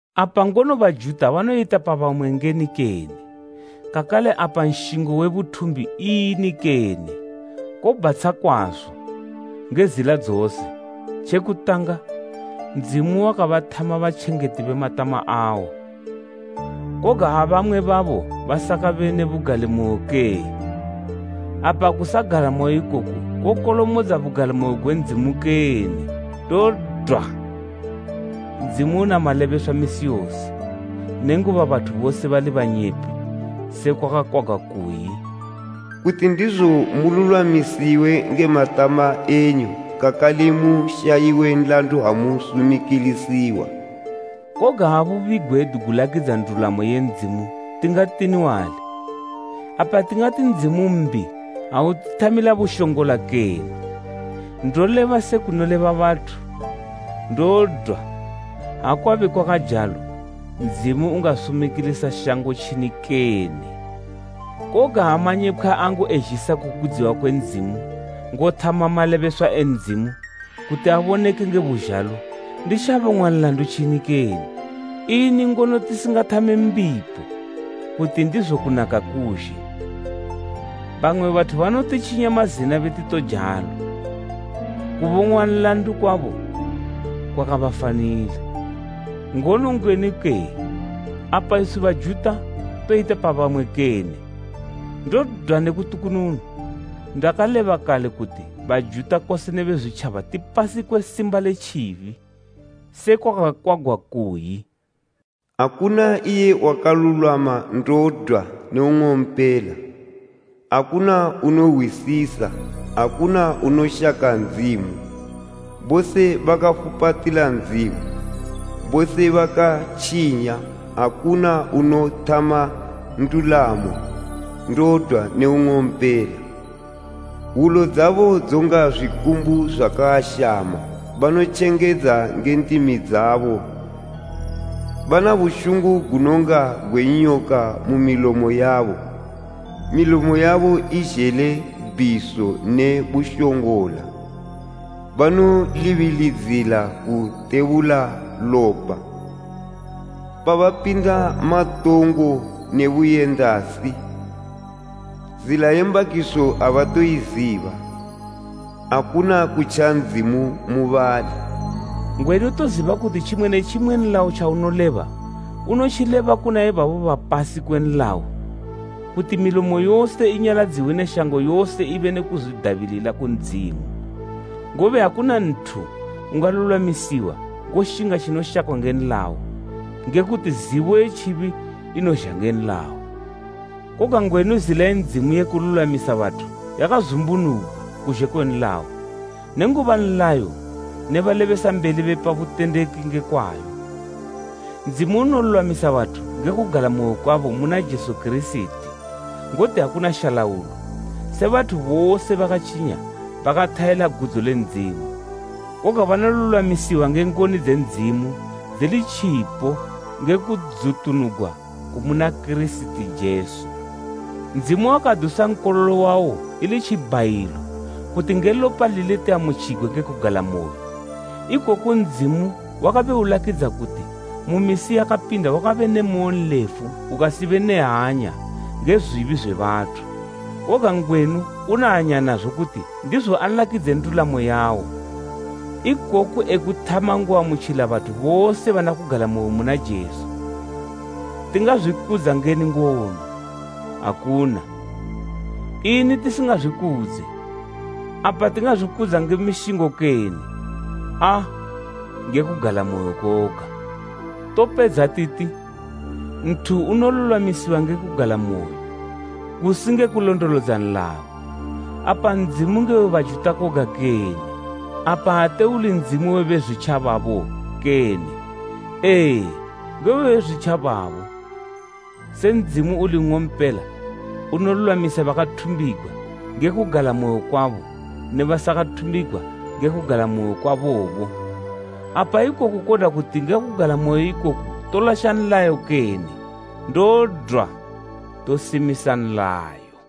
Apa ngono Bajuta banoyita pa bamwe ngeni kene? Kakale apa nshingo we buthumbi ini kene? Kobhatsha kwazo, nge zila dzose! Tje kutanga, Ndzimu wakabathama batjengeti be matama awo. Koga ha bamwe babo basakabe ne bugalimoyo kee? Apa kusagalamoyo ikoku kokolomodza bugalimoyo gwe Ndzimu kene? Ndodwa! Ndzimu una malebeswa misi yose, nenguba bathu bose bali banyepi, sekwa kwakakwagwa kuyi, “Kuti ndizo mululwamisiwe nge matama enyu, kakale mushayiwe nlandu ha musumikilisiwa.” Koga ha bubi gwedu gulakidza ndulamo ye Ndzimu tingatini wali? Apa tingati Ndzimu mbi ha utithamila bushongola kene? Ndoleba se kunoleba bathu. Ndodwa! Ha kwabe kwakajalo Ndzimu ungasumikilisa shango tjini kene? Koga ha manyepkhwa angu ezhisa kukudziwa kwe Ndzimu ngothama malebeswa e Ndzimu kuti aboneke nge buzhalo, ndi tja bongwa nlandu ntjini kene? Ini ngono tisingathame mbipo, kuti ndizo kunaka kuzhe? Bamwe bathu banotitjinya mazina beti tojalo. Kubong'wa nlandu kwabo kwakabafanila. Ngono ngwenu kee? Apa iswi Bajuta toyita pa bamwe kene? Ndodwa ne kutukununu! Ndakaleba kale kuti Bajuta kose ne Bezwitjaba tipasi kwe simba le tjibi, sekwa kwakakwagwa kuyi, “Akuna iye wakalulwama, ndodwa ne nng'ompela. Akuna unohwisisa, akuna unoshaka Ndzimu. Bose bakafupatila Ndzimu, bose bakatjinya. Akuna unothama ndulamo, ndodwa ne nng'ompela. Wulo dzabo dzonga zwikumbu zwakaashama banotjengedza nge ndimi dzabo bana bushungu gunonga gwe nyoka mu milomo yabo, milomo yabo izhele bhiso ne bushongola. Banolibilidzila kutebula lopa, pabapinda matongo ne buyendasi, zila ye mbakiso abatoiziba. Akuna kutja Ndzimu mubali.” Ngwenu toziba kuti tjimwe ne tjimwe nlayo tjaunoleba, unotjileba kuna ibabo bapasi kwe nlayo, kuti milomo yose inyaladziwe ne shango yose ibe ne kuzwidabilila ku Ndzimu, ngobe akuna nthu ungalulwamisiwa ngoshinga tjinoshakwa nge nlayo, nge kuti zibo ye tjibi inozha nge nlayo. Koga ngwenu zila ye Ndzimu ye kululwamisa bathu yakazumbunugwa kuzhe kwe nlayo, nenguba nlayo ne balebesambeli bepa butendeki nge kwayo. Ndzimu unolulwamisa bathu nge kugalamoyo kwabo muna Jesu Kirisiti. Ngoti akuna shalaulo, se bathu bose bakatjinya bakathayela gudzo le Ndzimu. Koga banolulwamisiwa nge ngoni dze Ndzimu dzili tjipo nge kudzutunugwa kumuna Kirisiti Jesu, Ndzimu wakadusa Nkololo wawo ili tjibhayilo kuti nge lopa lile tiamutjigwe nge kugalamoyo. Ikoku Ndzimu wakabe ulakidza kuti mu misi yakapinda wakabe ne moyo nlefu ukasibe ne hanya nge zwibi zwe bathu, koga ngwenu una hanya nazo kuti ndizo alakidze ndulamo yawo. Ikoku ekuthama ngoamutjila bathu bose bana kugalamoyo muna Jesu. Tingazwikudza ngeni ngono? Akuna. Ini tisingazwikudze? Apa tingazwikudza nge mishingo kene? Aa, nge kugalamoyo koga. Topedza titi, nthu unolulwamisiwa nge kugalamoyo, kusi nge kulondolodza nlayo. Apa Ndzimu nge we Bajuta koga kene? Apa ate uli Ndzimu we Bezwitjababo kene? Ee, nge we Bezwitjababo. Se Ndzimu uli nng'ompela unolulwamisa bakathumbigwa nge kugalamoyo kwabo ne basakathumbigwa nge kugalamoyo kwabobo. Apa ikoku kodwa kuti nge kugalamoyo ikoku tolasha nlayo kene? Ndodwa! Tosimisa nlayo.